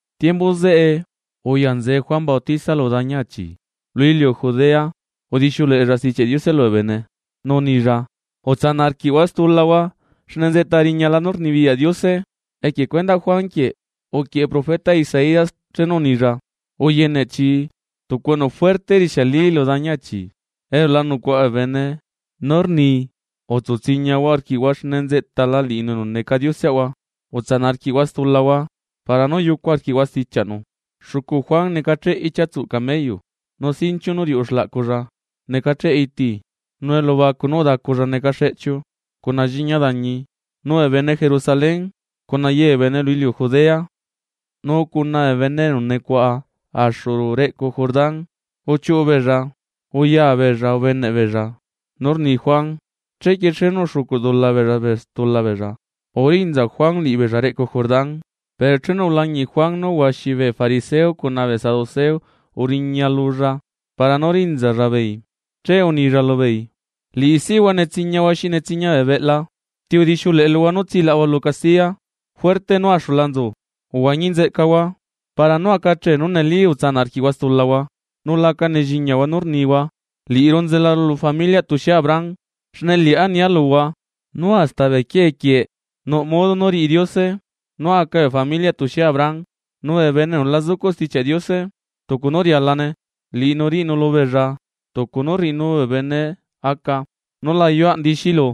Tiembu zeꞌe uyanzee Juan Bautista lu dañi achi lu iliu Judea udixiuleꞌella Stichiaꞌ Diose lubee bene. Nu unilla: ―Utsanaꞌ arquiꞌhua stulahua xne nzeꞌta riñala nú rnibiyaꞌ Diose. Equie cuendaꞌ Juan Bautista quieꞌ, uquieꞌe profeta Isaías chenu unilla: Uyene chi tucu enu juerte rixiali lu dañi achi elu la nucuaꞌa bee bene nú rni: “Utsu tsiñahua arquiꞌhua xne nzeꞌtala liꞌinu enu neca Dioseꞌahua, utsanaꞌ arquiꞌhua stulahua para nú yucu arquiꞌhua stichiaꞌnu.” Xucu Juan necacheꞌe ichia tsuꞌ camello, nu sinchiu nú riuꞌu xlaꞌculla necacheꞌ iti, nu elubacu nú udaculla neca xeꞌchiu cuna lliña dañi. Nu bee bene Jerusalén cuna ye bee bene lu iliu Judea nu cuna bee bene enu nucuaꞌa axu reꞌcu Jordán uchiuꞌu beella, uya beella ubeneꞌ beella nú rni Juan. Chequie chenu uxucuꞌ dula beella stula beella, urinza Juan liꞌibeella reꞌcu Jordán. Pero chenu ulañiꞌ Juan nú huaxi bee fariseo cuna saduceo uriña lulla para nú rinzalla beei, che unilla lubeei: ―¡Liꞌisihua netsiñahua xi netsiña bee beꞌla! ¿Ti udixiuleꞌe luhua nú tsilaꞌahua lu castiya juerte nú axula nzu zeca bee bene? Uhuañi nzeꞌcahua para nú aca chee nú neli utsanaꞌ arquiꞌhua stulahua, nula aca nelliñahua nú rnihua: “Liꞌiru nzelaru lu familiaꞌ tuxie Abraham”, xne liꞌá nia luhua nú hasta bee quiee quieꞌ nuꞌ modo nú riꞌi Diose nú aca bee familiaꞌ tuxie Abraham. Nu bee bene enu la zucuꞌ Stichiaꞌ Diose tucu nú rialane, liꞌinu riꞌinu lubeella tucu nú rriꞌinu bee bene aca nú la ayuaꞌ ndixilu,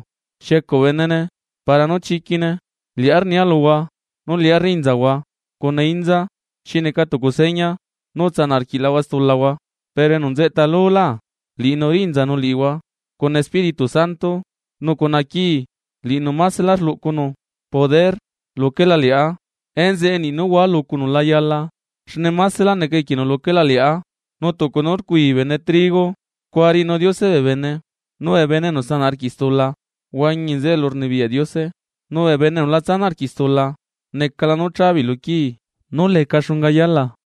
xiecuꞌ benene para nú chiquine. Liꞌá, rniaa luhua nú liꞌá rrinzahua cuna inza xineca tucu seña nú utsanaꞌ arquiꞌlahua stulahua, pero enu nzeꞌta lulá liꞌinu rinzanu liꞌihua cuna Espíritu Santo nu cuna quii. Liꞌinu maselá rluꞌcunu poder luquela liꞌá, enzeꞌe niꞌ nú hua lucunu la yala xne masela neca equienu luquela liꞌá. Nu tucu nú rcuii bene trigo scua riꞌinu Diose bee bene. Nu bee bene enu sanaꞌ arquiꞌ stula huañi bee nzeꞌe elurnibiyaꞌ Diose, nu bee bene enu la tsanaꞌ arquiꞌ stula necala nú cha beei lu quii nú leca xunga yala.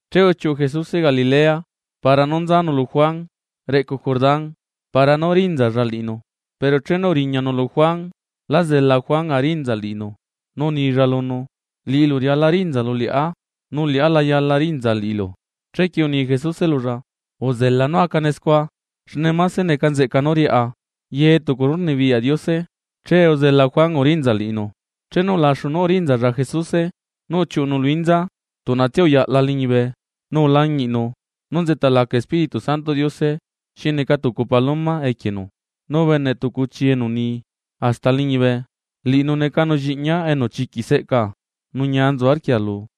Che uchiuꞌu Jesuse Galilea para nú nzanu lu Juán reꞌcu Jordán, para nú rinzalla liꞌinu. Pero chenu uriñanu lu Juan lá zela Juan arinza liꞌinu, nu unilla lunu: ―Liꞌilu riala rinzalu liꞌá, ¿nu liꞌá la yala rinza liꞌilu? Chequie uni Jesuse lulla: ―Uzela nú acane scua, xne mase neca nzeꞌca nú riaꞌa ye tucu nú rnibiyaꞌ Diose. Chee uzela Juan urinza liꞌinu. Chenu ulaxu nú urinzalla Jesuse, nu uchiuꞌunu lu inza, tuꞌnatsia uyaꞌla liñibe, nu ulañiꞌnu nú nzeꞌta laca Espíritu Santoꞌ Diose xi naa tucu paloma equienu. Nu ubene tucu chii enu uni hasta liñibe: ―Liꞌinu necanu lliꞌñia enu chiquiꞌ seꞌcaa, nu ñia nzu arquia lu.